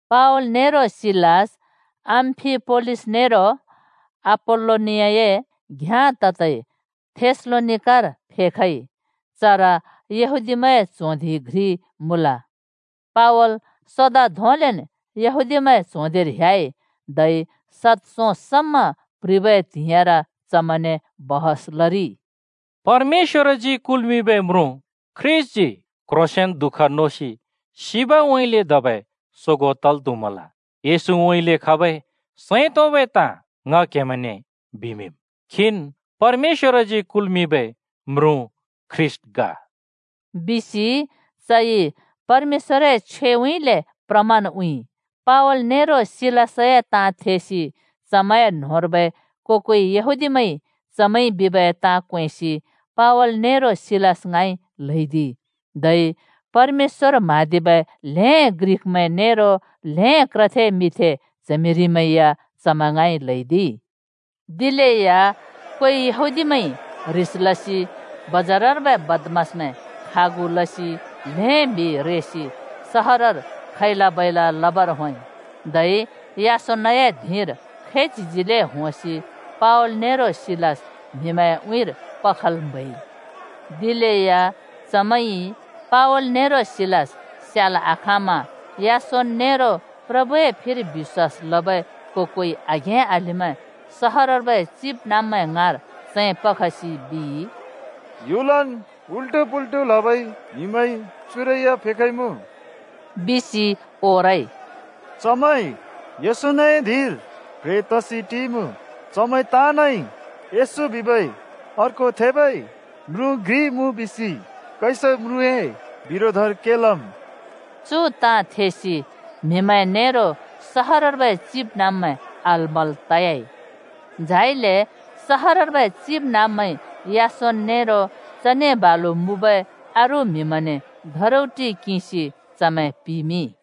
पावल नेरो सिलास अम्‍फिपोलिस नेरो अपोल्‍लोनियाए घ्याँ ततै थेसलोनिकार फेखइ। चर यहूदीमैंए च्हों धिं घ्रि मुँल। पावल सोदा धोंलेन् यहूदीमैंए च्हों धिंर ह्‍याइ। धै सद सों समा प्रिबै त्हिंइर चमैंने छलफल लरिइ। “परमेश्‍वरजी कुल्मिंबै म्रुँ ख्रीष्‍टजी क्ह्रोंसेंन दुःख नोसि सिबउँइँले धबै सोगों तल् त्हुमल। येशूउँइँले खबै सैं तोंबै ताँ ङ क्हेमैंने बिमिंम्। खीन् परमेश्‍वरजी कुल्मिंबै म्रुँ ख्रीष्‍ट ग!” बिसि चइ परमेश्‍वरए छ्वेउँइँले प्रमाण उँइँइ। पावल नेरो सिलासए ताँ थेसि चमैंए न्‍होंर्बै को-कोइ यहूदीमैंइ चमैंइ बिबै ताँ क्वेंसि पावल नेरो सिलास ङाँइ ल्हैदिइ। धै परमेश्‍वर म्‍हाँदिबै ल्‍हें ग्रिकमैं नेरो ल्हें क्रथे मिंथे च्हमिरिमैं या चमैं ङाँइ ल्हैदिइ। दिलेया कोइ यहूदीमैंइ ह्रिस लसि बजारर्बै बदमासमैं खागु लसि ल्हें म्हि रेसि सहरर खैला-बैला लबर होंइ, धै यासोनए धिंर खैच्हिजिले होंसि पावल नेरो सिलास म्हिमैंए उँइँर पखल् म्हैइ। दिलेया चमैंइ पावल नेरो सिलास स्याल् आखाँमा यासोन नेरो प्रभुए फिर बिश्‍वास लबै को-कोइ आघें-अलिमैं सहरर्बै चिबनाँब्मैं ङाँर चैं पखसि बिइ, “ह्‍युलन् उल्टो-पुल्टु लबै म्हिमैं चुरै या फेखइमुँ,” बिसि ओरइ। “चु यासोनए धिंर चमैं प्ह्रें तसि टिइमुँ, चमैं ताँनइ येशू बिबै अर्को थेबै म्रुँ घ्रि मुँ बिसि कैसर म्रुँए बिरोधर के लम्।” चु ताँ थेसि म्हिमैं नेरो सहरर्बै चिबनाँब्मैं आल-मल तयाइ। झाइले सहरर्बै चिबनाँब्मैंइ यासोन नेरो चने बालु मुँबै अरू म्हिमैंने धरौटि किंसि चमैं पिमिंइ।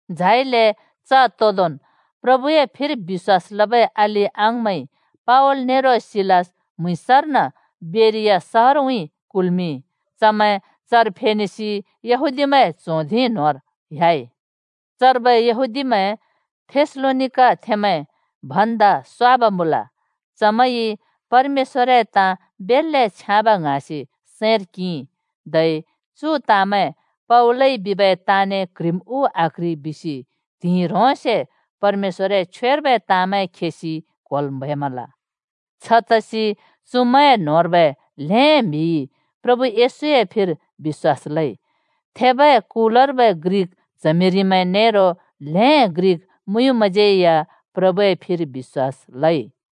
झाइले च तोंदोंन् प्रभुए फिर बिश्‍वास लबै अलि-अङाँमैंइ पावल नेरो सिलास म्‍हुँइँसर्न बेरिया सहरउँइँ कुल्मिंइ, चमैं चर फेनेसि यहूदीमैंए च्हों धिं न्होंर ह्‍याइ। चर्बै यहूदीमैं थेसलोनिकाथेंमैं भन्दा स्वाब मुँल: चमैंइ परमेश्‍वरए ताँ बेल्‍ले छ्याँब ङ्हाँसि सैंर किंइ, धै चु ताँमैं पावलइ बिबै ताँने क्ह्रिम् उ आक्ह्रि बिसि त्हिंइ ह्रोंसे परमेश्‍वरए छ्वेर्बै ताँमैं खेसि क्होल् म्हैमल। छतसि चुमैंए न्होंर्बै ल्हें म्हिइ प्रभु येशूए फिर बिश्‍वास लइ। थेबै कुलर्बै ग्रिक च्हमिरिमैं नेरो ल्हें ग्रिक मुँयुँमैंज्यै या प्रभुए फिर बिश्‍वास लइ।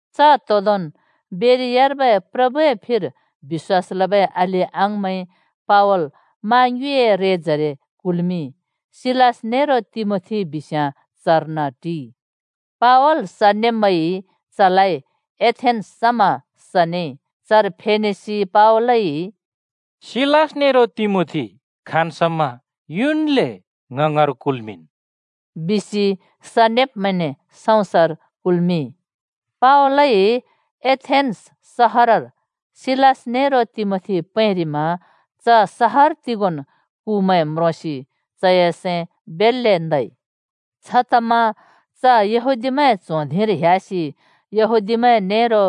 च तोंदोंन् बेरियार्बै प्रभुए फिर बिश्‍वास लबै अलि-अङाँमैंइ पावल मा ङ्युँइए रेजरे कुल्मिंइ। सिलास नेरो तिमोथी बिस्याँ चर्न टिइ। पावल सनेब्मैंइ चलाइ एथेन्‍स समा सनेइ। चर फेनेसि पावलइ “सिलास नेरो तिमोथी खाँन् समा युन्‍ले ङ ङाँर कुल्‍मिंन्,” बिसि सनेब्मैंने सँउँसर कुल्मिंइ। पावलइ एथेन्‍स सहरर सिलास नेरो तिमोथी पैंरिमा च सहर तिगोंन् कुमैंइ प्लिंरिब् म्रोंसि चए सैं बेल्‍ले नइ। छतमा च यहूदीमैं च्हों धिंर ह्‍यासि यहूदीमैं नेरो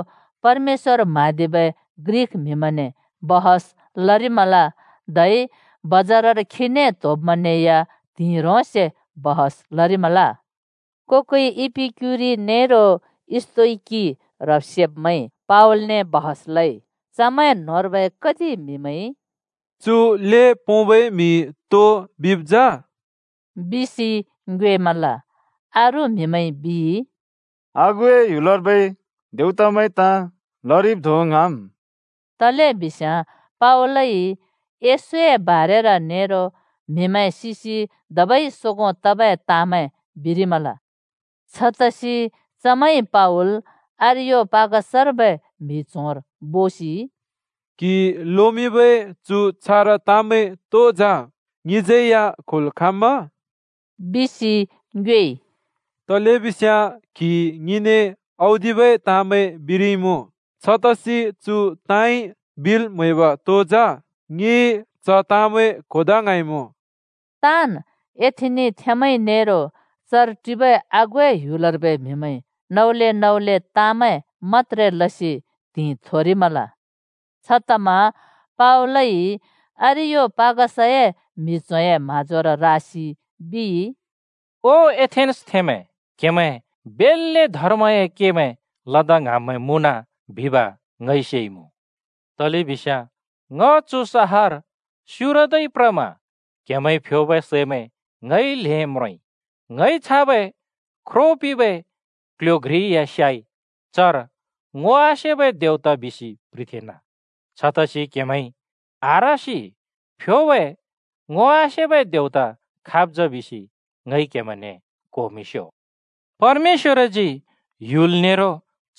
परमेश्‍वर म्‍हाँदिबै ग्रिक म्हिमैंने छलफल लरिमल, धै बजारर खीने त्होब्मैंने या त्हिंइ ह्रोंसे छलफल लरिमल। को-कोइ इपिक्‍युरि नेरो स्‍तोइकि ह्रब्-सेब्मैंज्यै या पावलने छलफल लइ। चमैं न्होंर्बै कति म्हिमैंइ “चु ल्हें पोंबै म्हिइ तो बिइमुँ जा?” बिसि ङ्योएमल। अरू म्हिमैंइ बिइ, “आगुए ह्‍युलर्बै देवतामैंए ताँ लरिब् धों ङ्हाँम्।” तलेबिस्याँ पावलइ येशूए बारेर नेरो म्हिमैं सिसि धबै सोगों तबै ताँमैं बिरिमल। छतसि चमैंइ पावल अरियोपागसर्बै म्हि च्होंर बोसि, “क्हिइ लोमिंबै चु छारा ताँमैं तो जा? ङिज्यै या क्होल् खाँम्‍मा?” बिसि ङ्योएइ। “तलेबिस्याँ क्हिइ ङिने औदिबै ताँमैं बिरिइमुँ। छतसि चु ताँइ बिल् म्हैब तो जा? ङि च ताँमैं क्होदा ङ्हाँइमुँ।” (ताँन् एथेनिथेंमैंइ नेरो चर टिबै आगुए ह्‍युलर्बै म्हिमैंइ नौले-नौले ताँमैं मत्‍त्रे लसि त्हिंइ थोरिमल।) छतमा पावलइ अरियोपागसए म्हि च्होंए म्हाँजोर रासि बिइ, “ओ एथेन्‍सथेंमैं! क्हेमैं बेल्‍ले धर्मए केमैं लदा ङ्हाँब्मैं मुँन बिब ङइ सेइमुँ। तलेबिस्याँ ङ चु सहर स्युरदै प्रमा क्हेमैंइ फ्योबै सैमैं ङइ ल्हें म्रोंइ। ङइ छाबै ख्रो पिंबै क्ल्ह्‍यो घ्रि या स्याइ। चर ‘ङो आसेबै देवता’ बिसि प्ह्रिथेंना। छतसि क्हेमैंइ आह्रसि फ्योबै ‘ङो आसेबै देवता’ खाब् जा बिसि ङइ क्हेमैंने क्होमिंस्यो। परमेश्‍वरजी ह्‍युल नेरो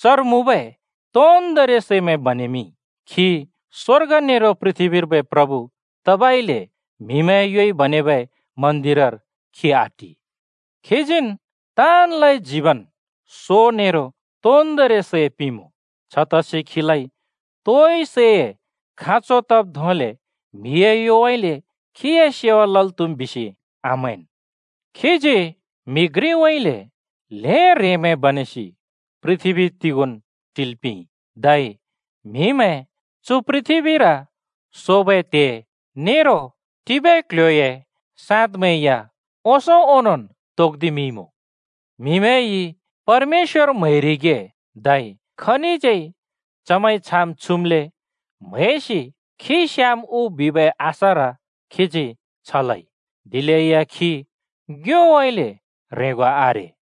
चर मुँबै तोन्दोंरि सैमैं बनेमिंइ। खी स्वर्ग नेरो पृथ्बीर्बै प्रभु तबइले म्हिमैंए योइ बनेबै मन्दिरर खी आटि। खीजीन् ताँनलाइ जीवन, सो नेरो तोन्दोंरि सै पिंमुँ। छतसि खीलाइ तोइ सैए खाँचो तब् धोंले म्हिए योउँइँले खीए सेवा लल् त्हुम् बिसि आमैंन्। खीजी म्‍हि घ्रिउँइँले ल्हें ह्रेंमैं बनेसि पृथ्बी तिगोंन् टिल् पिंइ। धै म्हिमैं चु पृथ्‍बीर सोबै त्हे निबै टिबै क्ल्ह्‍योए साँदमैं या ओंसों ओंनोंन् तोक्दिमिंइमुँ। ‘म्हिमैंइ परमेश्‍वर म्हैरिगे धै खनिज्यै चमैंइ छाम् छुमले म्हैसि खी स्याम् उ’ बिबै आशार खीजी छ लइ। दिलेया खी ङ्योउँइँले ह्रेंगो आरे।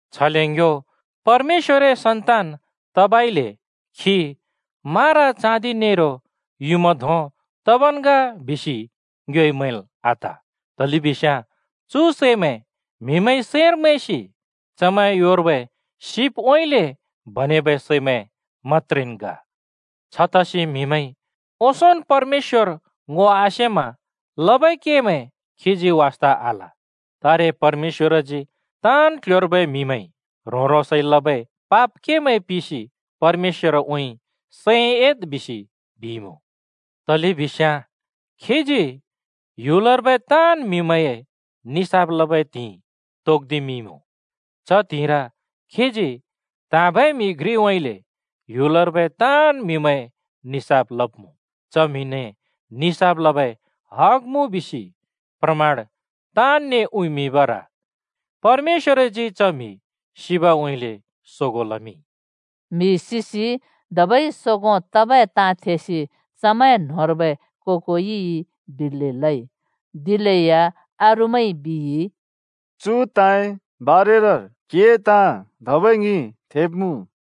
छले ङ्यो परमेश्‍वरए सन्तान तबइले खी मारा-चाँदि नेरो युँमा धों तबन् ग बिसि ङ्योइ मैंल् आत। तलेबिस्याँ चु सैमैं म्हिमैंइ सैंर मैंसि चमैंए योर्बै सिपउँइँले बनेबै सैमैं मत्‍त्रेन् ग। छतसि म्हिमैंइ ओंसोंन् परमेश्‍वर ङो आसेमा लबै केमैं खीजी वास्ता आल। तारे परमेश्‍वरजी ताँन् क्ल्ह्‍योर्बै म्हिमैंइ ह्रों-ह्रोंसइ लबै पाप केमैं पिसि परमेश्‍वरउँइँ सैं एद् बिसि बिइमुँ। तलेबिस्याँ खीजी ह्‍युलर्बै ताँन् म्हिमैंए निसाफ लबै त्हिंइ तोक्दिमिंइँमुँ। च त्हिंइर खीजी त्हाँबै म्हि घ्रिउँइँले ह्‍युलर्बै ताँन् म्हिमैंए निसाफ लब्मुँ। च म्हिने निसाफ लबै हग मुँ बिसि प्रमाण ताँनने उँइमिंबर परमेश्‍वरजी च म्हि सिबउँइँले सोगों लमिंइ।” म्हि सिसि धबै सोगों तबै ताँ थेसि चमैं न्होंर्बै को-कोइ बिल्‍लि लइ। दिलेया अरूमैंइ बिइ, “चु ताँए बारेर क्हिए ताँ धबै ङि थेब्मुँ।”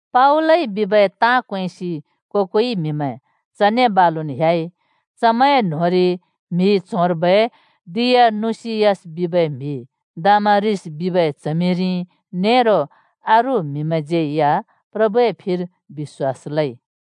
पावलइ बिबै ताँ क्वेंसि को-कोइ म्हिमैं चने बालुन् ह्‍याइ। चमैंए न्होंरि म्हि च्होंर्बै डियनुसियस बिबै म्हि, दामारिस बिबै च्हमिरि, नेरो अरू म्हिमैंज्यै या प्रभुए फिर बिश्‍वास लइ।